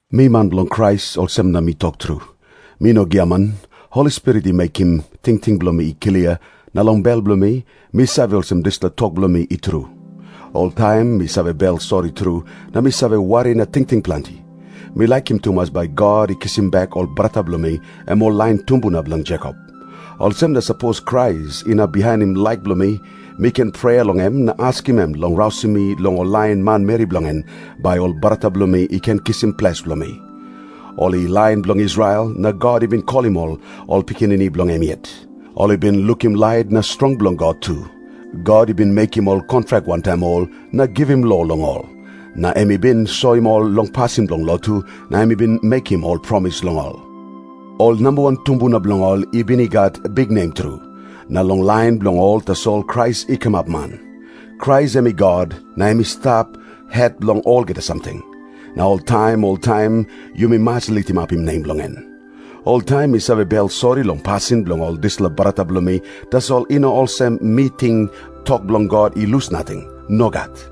Mi man bilong Krais, olsem na mi tok tru. Mi no giaman. Holi Spirit i mekim tingting bilong mi i klia, na long bel bilong mi, mi save olsem dispela tok bilong mi i tru. Oltaim mi save bel sori tru, na mi save wari na tingting planti. Mi laikim tumas bai God i kisim bek ol brata bilong mi, em ol lain tumbuna bilong Jekop. Olsem na sapos Krais inap bihainim laik bilong mi, mi ken prea long em na askim em long rausim mi long lain manmeri bilong en, bai ol brata bilong mi i ken kisim ples bilong mi. Ol i lain bilong Israel, na God i bin kolim ol pikinini bilong em yet. Ol i bin lukim lait na strong bilong God tu. God i bin mekim ol kontrak wantaim ol, na givim lo long ol. Na em i bin soim ol long pasin bilong lotu, na em i bin mekim ol promis long ol. Ol namba wan tumbuna bilong ol i bin i gat biknem tru. Na long lain bilong ol tasol Krais i kamap man. Krais em i God, na em i stap het bilong olgeta samting. Na oltaim oltaim yumi mas litimapim nem bilong en. Oltaim mi save bel sori long pasin bilong ol dispela brata bilong mi, tasol i no olsem mi ting tok bilong God i lus nating. Nogat.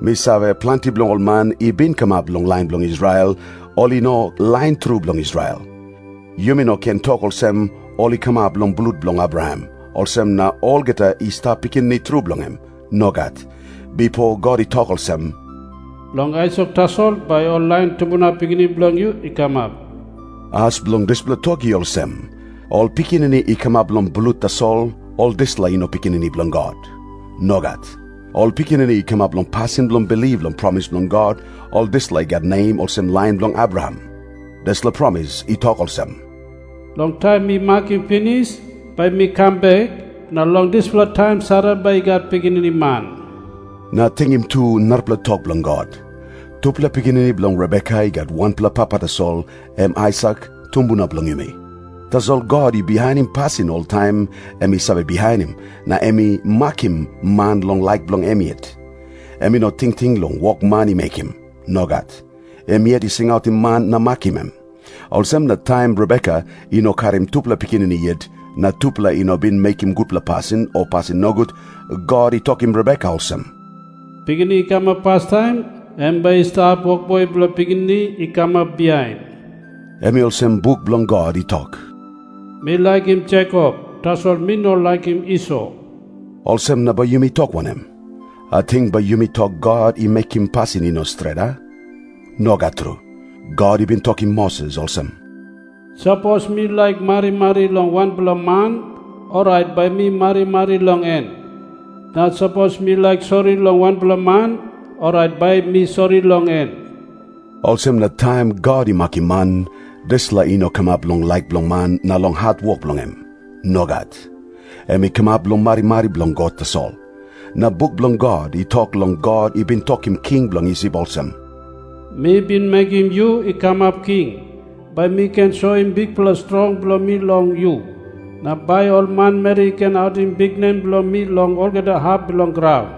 Mi save, planti bilong ol man i bin kamap long lain bilong Israel, ol i no lain tru bilong Israel. Yumi no ken tok olsem, “Ol i kamap long blut bilong Abraham, olsem na olgeta i stap pikinini tru bilong em.” Nogat. Bipo God i tok olsem, “Long Aisak tasol bai ol lain tumbuna pikinini bilong yu i kamap.” As bilong dispela tok i olsem. Ol pikinini i kamap long blut tasol, ol dispela i no pikinini bilong God. Nogat. Ol pikinini i kamap long pasin bilong bilip long promis bilong God, ol dispela i gat nem olsem lain bilong Abraham. Dispela promis i tok olsem, “Long taim mi makim pinis, bai mi kam bek, na long dispela taim Sara bai i gat pikinini man.” Na tingim tu narapela tok bilong God. Tupela pikinini bilong Rebeka i gat wanpela papa tasol, em Aisak, tumbuna bilong yumi. Tasol God i bihainim pasin oltaim em i save bihainim, na em i makim man long laik bilong em yet. Em i no tingting long wok man i mekim. Nogat. Em yet i singautim man na makim em. Olsem na taim Rebeka i no karim tupela pikinini yet, na tupela i no bin mekim gutpela pasin o pasin nogut, God i tokim Rebeka olsem, “Pikinini i kamap pastaim, em bai i stap wokboi bilong pikinini i kamap bihain.” Em i olsem buk bilong God i tok, “Mi laikim Jekop, tasol mi no laikim Iso.” Olsem na bai yumi tok wanem? Ating bai yumi tok God i mekim pasin i no stret, a? Nogat tru. God i bin tokim Moses olsem, “Sapos mi laik marimari long wanpela man, orait bai mi marimari long en. Na sapos mi laik sori long wanpela man, orait bai mi sori long en.” Olsem na taim God i makim man, dispela i no kamap long laik bilong man na long hatwok bilong em. Nogat. Em i kamap long marimari bilong God tasol. Na buk bilong God i tok long God i bin tokim king bilong Isip olsem, “Mi bin mekim yu i kamap king, bai mi ken soim bikpela strong bilong mi long yu, na bai ol manmeri i ken autim biknem bilong mi long olgeta hap bilong graun.”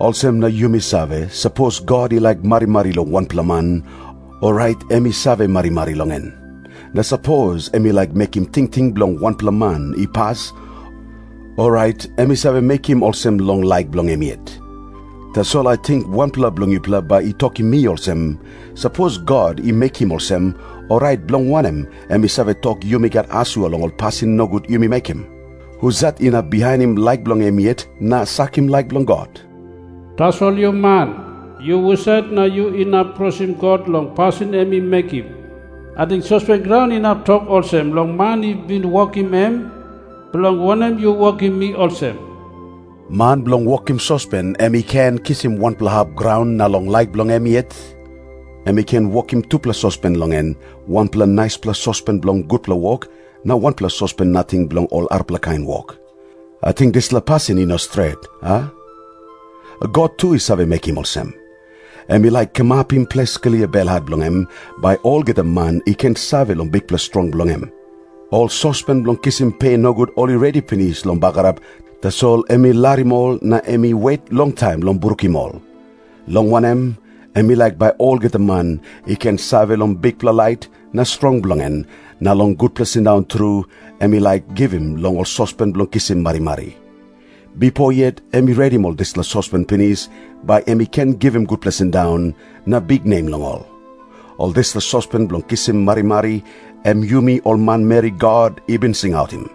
Olsem na yumi save, sapos God i laik marimari long wanpela man, orait em i save marimari long en. Na sapos em i laik mekim tingting bilong wanpela man i pas, orait em i save mekim olsem long laik bilong em yet. Tasol ating wanpela bilong yupela bai i tokim mi olsem, “Sapos God i mekim olsem, orait bilong wanem em i save tok yumi gat asua long ol pasin nogut yumi mekim? Husat inap bihainim laik bilong em yet, na sakim laik bilong God?” Tasol yu man, yu husat na yu inap krosim God long pasin em i mekim? Ating sospen graun inap tok olsem long man i bin wokim em, “Bilong wanem yu wokim mi olsem?” Man bilong wokim sospen em i ken kisim wanpela hap graun na long laik bilong em yet, em i ken wokim tupela sospen long en, wanpela naispela sospen bilong gutpela wok, na wanpela sospen nating bilong ol arapela kain wok. Ating dispela pasin i no stret, a? God tu i save mekim olsem. Em i laik kamapim ples klia belhat bilong em, bai olgeta man i ken save long bikpela strong bilong em. Ol sospen bilong kisim pe nogut ol i redi pinis long bagarap, tasol em i larim ol na em i wet longtaim long brukim ol. Long wanem, em i laik bai olgeta man i ken save long bikpela lait na strong bilong en, na long gutpela sindaun tru em i laik givim long ol sospen bilong kisim marimari. Bipo yet em i redim ol dispela sospen pinis bai em i ken givim gutpela sindaun na biknem long ol. Ol dispela sospen bilong kisim marimari, em yumi ol manmeri God i bin singautim.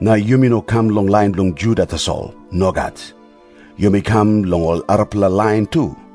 Na yumi no kam long lain bilong Juda tasol. Nogat. Yumi kam long ol arapela lain tu.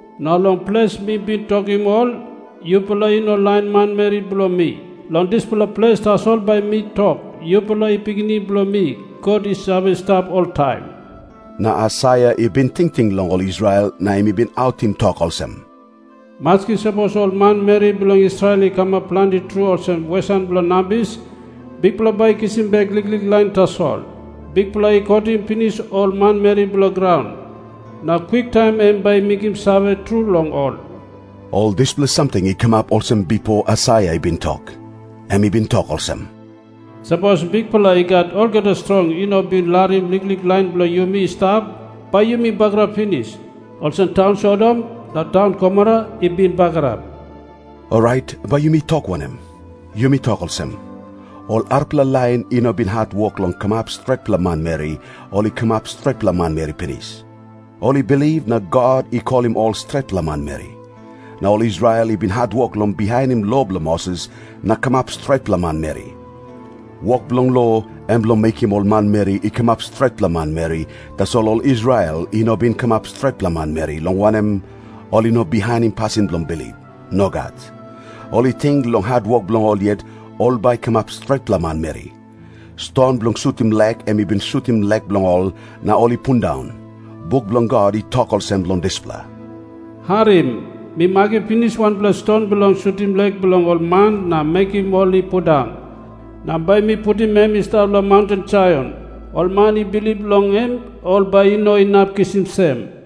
Na long ples mi bin tokim ol, ‘Yupela i no lain manmeri bilong mi,’ long dispela ples tasol bai mi tok, ‘Yupela i pikinini bilong mi, God i save stap oltaim.’” Na Aisaia i bin tingting long ol Israel na em i bin autim tok olsem, “Maski sapos ol manmeri bilong Israel i kamap planti tru olsem wesan bilong nambis, Bikpela bai i kisim bek liklik lain tasol. Bikpela i kotim pinis ol manmeri bilong graun, na kwiktaim em bai i mekim save tru long ol.” Ol dispela samting i kamap olsem bipo Aisaia i bin tok. Em i bin tok olsem, “Sapos Bikpela I Gat Olgeta Strong i no bin larim liklik lain bilong yumi i stap, bai yumi bagarap pinis, olsem taun Sodom na taun Gomora i bin bagarap.” Orait bai yumi tok wanem? Yumi tok olsem. Ol arapela lain i no bin hatwok long kamap stretpela manmeri, ol i kamap stretpela manmeri pinis. Ol i bilip na God i kolim ol stretpela manmeri. Na ol Israel i bin hatwok long bihainim lo bilong Moses na kamap stretpela manmeri. Wok bilong lo, em bilong mekim ol manmeri i kamap stretpela manmeri, tasol ol Israel i no bin kamap stretpela manmeri, long wanem, ol i no bihainim pasin bilong bilip. Nogat. Ol i ting, long hatwok bilong ol yet, ol bai i kamap stretpela manmeri. Ston bilong sutim lek em i bin sutim lek bilong ol na ol i pundaun. Buk bilong God i tok olsem long dispela, “Harim. Mi makim pinis wanpela ston bilong sutim lek bilong ol man na mekim ol i pundaun. Na bai mi putim em i stap long maunten Saion. Ol man i bilip long em, ol bai i no inap kisim sem.”